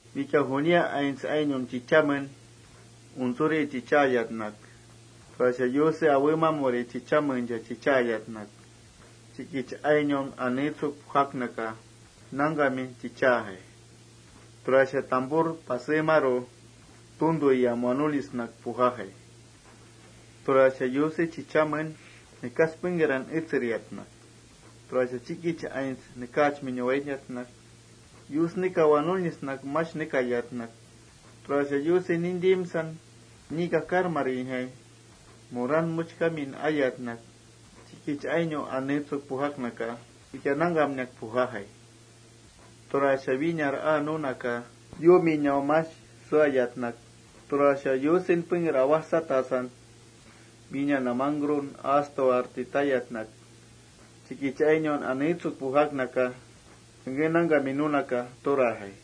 Wikia junia aints ainau chichamen untsuri chichaayatnak, tura Yuse awemamuri chichamencha chichaayatnak, chikich ainaun aneetsuk pujaknaka nangkami chichainjai. Tura tampur mesramu nangkami tuntuyamua nunisnak pujuinjai. Tura Yuse chichamen nekas pengkeran etseriatnak, tura chikich ainau nekaachminun wainiatnak, Yus nekawa nunisnak mash nekayatnak, tura Yusen nintimsan ni kakarmarijai muran muchkiamin ayatnak, chikich ainaun aneetsuk pujaknaka wikia nangkamnak pujuinjai.+ Tura winar aa nunaka yuuminaun mash suayatnak, tura Yusen pengker awajsatasan wína namangkrun astuwarti tayatnak, chikich ainaun aneetsuk pujaknaka, pengké nangkamin tajai.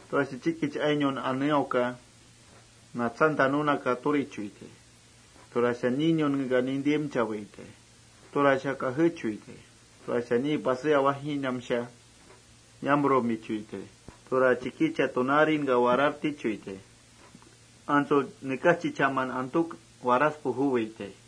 Tura chikich ainaun aneauka natsanta nunaka turichuitai. Tura ninunkeka nintimchawaitai. Tura kajechuitai. Tura ni pasé awajinamsha yapaijmichuitai. Tura chikichan pasé awajinamtaisha warartichuitai. Antsu nekas chichaman antuk waras pujuwitai.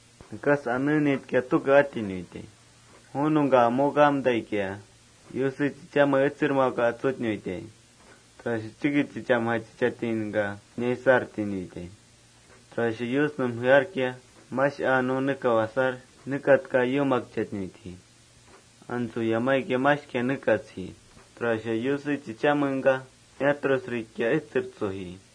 Nekas aneenitka tuke atinuitai. Ju nungka amukamtaikia, Yuse chichame etsermauka atsutnuitai. Tura chikich chichamjai niish chichastinaka inaisartinuitai. Tura Yusnum jearkia, mash aa nu nekau asar nekatka yuumakchatnuitji. Antsu yamaikia mashkia nekatsji. Tura Yuse chichamengka miatrusrikia etsertsuji.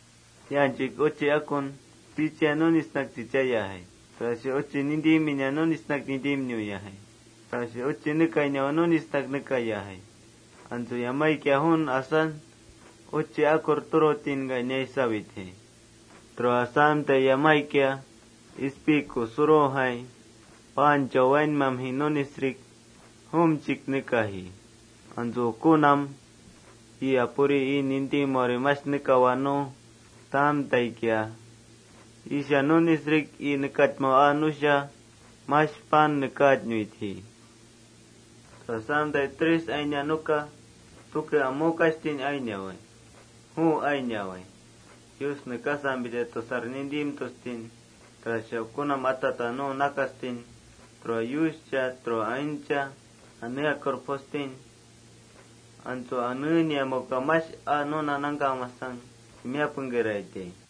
Yaanchuik uchi akun, uchia nunisnak chichaiyajai. Tura uchi nintimina nunisnak nintimnuyajai. Tura uchi nekainawa nunisnak nekaiyajai. Antsu yamaikia juun asan, uchi akur nintimtainka inaisawaitjai. Tura asamtai yamaikia ispi kusurujai paanchau wainmamji nunisrik jumchik nekaji. Antsu ukunam ii Apuri ii nintimaurin mash aa nuna nekau asa nu taamtaikia, iisha nunisrik ii nekachmau aa nusha mash paan nekaatnuitji.+ Tura asamtai kampatam tuke amukashtin ainia nuka juwaitai: Yus nekasampita tusar nintimtustin, tura ukunam atata nu nakastin, tura Yuscha tura aintcha aneakur pujustin. Antsu anengkrataingkia mash ainia nuna nangkamasang timiá pengkeraitai.